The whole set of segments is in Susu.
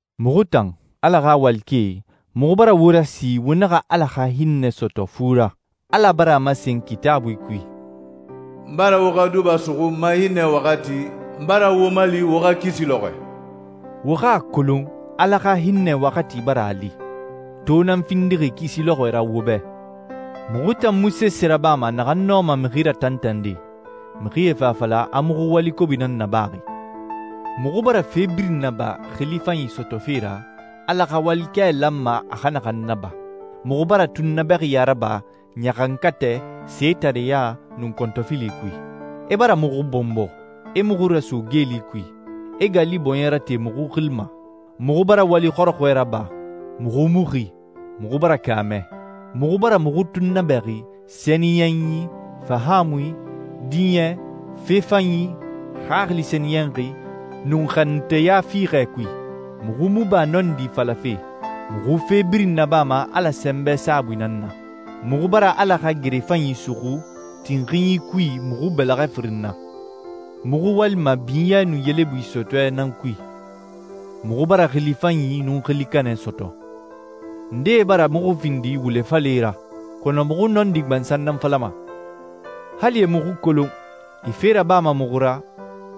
Muxu tan, Ala xa walikɛe, muxu bara wo rasi wo naxa Ala xa hinnɛ sɔtɔ fu ra. Ala bara a masen Kitaabui kui, «N bara wo xa duba suxu n ma hinnɛ waxati, n bara wo mali wo xa kisi lɔxɔɛ.» Wo xa a kolon Ala xa hinnɛ waxati bara a li. To nan findixi kisi lɔxɔɛ ra wo bɛ. Muxu tan mu sese rabama naxan nɔma mixi ratantande, mixie fa a fala a muxu wali kobi nan nabaxi. Muxu bara fe birin naba xili fanyi sɔtɔfe ra Ala xa walikɛ lanma a xa naxan naba. Muxu bara tunnabɛxiya raba ɲaxankatɛ, setareɲa, nun kɔntɔfili kui. E bara muxu bɔnbɔ, e muxu raso geeli kui, e gali bɔɲɛ rate muxu xili ma. Muxu bara wali xɔrɔxɔɛ raba, muxu mu xi, muxu bara kaamɛ. Muxu bara muxu tunnabɛxi sɛniyɛnyi, fahaamui, diɲɛ, fe fanyi, xaxili sɛniyɛnxi, nun xanunteya fiixɛ kui. Muxu mu ba nɔndi falafe, muxu fe birin nabama Ala sɛnbɛ saabui nan na. Muxu bara Ala xa gere fanyi suxu tinxinyi kui muxu bɛlɛxɛ firin na. Muxu walima binyɛ nun yelebui sɔtɔɛ nan kui. Muxu bara xili fanyi nun xili kanɛ sɔtɔ. Ndee bara muxu findi wule falɛe ra, kɔnɔ muxu nɔndi gbansan nan falama. Hali e muxu kolon, e fe rabama muxu ra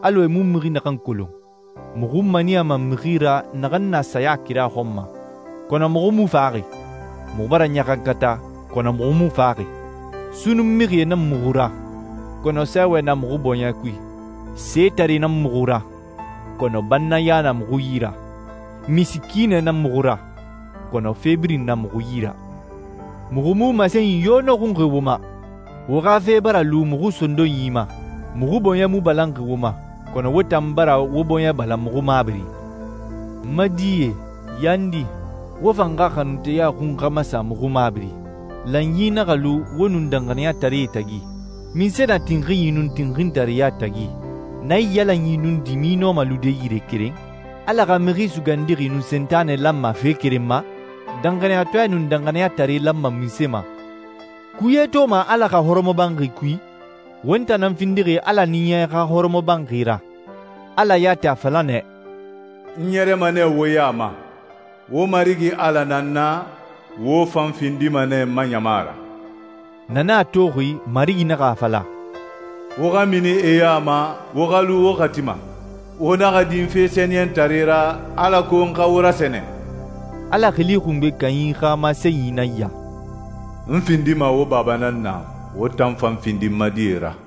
alɔ e mu mixi naxan kolon. Muxu maniyama mixi ra naxan na saya kira xɔn ma, kɔnɔ muxu mu faxaxi. Muxu bara ɲaxankata, kɔnɔ muxu mu faxaxi. Sunnun mixie nan muxu ra, kɔnɔ sɛɛwɛ na muxu bɔɲɛ kui. Setaree nan muxu ra, kɔnɔ bannaya na muxu yi ra. Misikiinɛe nan muxu ra, kɔnɔ fe birin na muxu yi ra. Muxu mu masenyi yo nɔxunxi wo ma. Wo xa fe bara lu muxu sondonyi ma. Muxu bɔɲɛ mu balanxi wo ma, kɔnɔ wo tan bara wo bɔɲɛ balan muxu mabiri. N ma die, yandi, wo fan xa xanunteya xun xa masa muxu mabiri. Lanyi naxa lu wo nun danxaniyataree tagi. Munse na tinxinyi nun tinxintareya tagi? Naiyalanyi nun dimi nɔma lude yire keren? Ala xa Mixi Sugandixi nun Sentanɛ lanma fe keren ma? Danxaniyatɔɛ nun danxaniyatare lanma munse ma? Kuye toma Ala xa hɔrɔmɔbanxi kui? Won tan nan findixi Ala Ɲiɲɛ xa hɔrɔmɔbanxi ra. Ala yati a fala nɛ, «N ɲɛrɛma nɛ wo ya ma. Wo Marigi Ala nan n na, wo fan findima nɛ n ma ɲama ra.» Na nan a toxi Marigi naxa a fala, «Wo xa mini e ya ma, wo xa lu wo xati ma. Wo naxa din fe sɛniyɛntare ra, alako n xa wo rasɛnɛ.» Ala Xili Xungbe Kanyi xa masenyi nan ya, «N findima wo baba nan na, wo tan fan findi n ma die ra.»